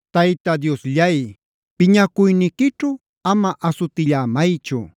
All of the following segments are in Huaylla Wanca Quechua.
Tayta Diosllay, piñacuyniquićhu ama asutillämaychu;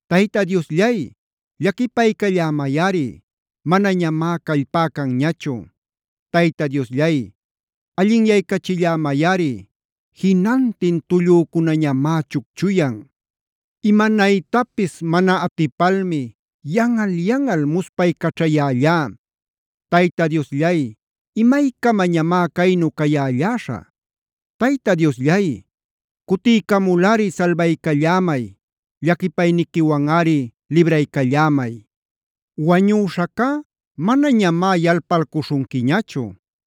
Tayta Diosllay, llaquipaycallämayꞌari; manañamá callpá canñachu. Tayta Diosllay, allinyaycachillämayꞌari. Jinantin tullücunañamá chucchuyan. Imanaytapis mana atipalmi yanꞌal-yanꞌal muspaycaćhayällá. Tayta Diosllay, ¿imaycamañamá caynu cayälläśhä? Tayta Diosllay, cutiycamulꞌari salbaycallämay; llaquipayniquiwanꞌari libraycallämay. Wañüśhacá manañamá yalpalcuśhunquiñachu.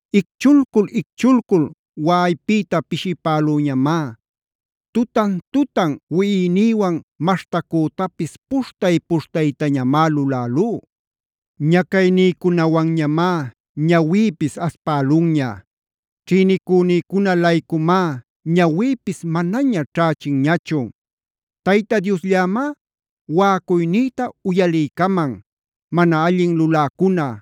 Icchulcul-icchulcul waꞌaypïta pishipälüñamá. Tutan-tutan wiꞌinïwan maśhtacütapis puśhtay-puśhtaytañamá lulälú. Ñacaynïcunawanñamá ñawïpis aspälunña. Ćhïnicunïcuna-laycumá ñawïpis manaña ćhächinñachu. Tayta Diosllämá waꞌacuynïta uyaliycaman; mana allin luläcuna,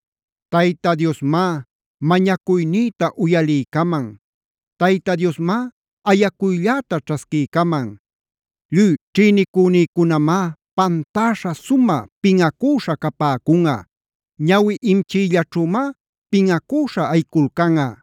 Tayta Diosmá mañacuynïta uyaliycaman; Tayta Diosmá ayacuylläta ćhasquiycaman. Lluy ćhïnicünïcunamá pantäśha sumä pinꞌacüśhä capäcunꞌa. Ñawi-imchiyllaćhümá pinꞌacüśhä ayiculcanꞌa.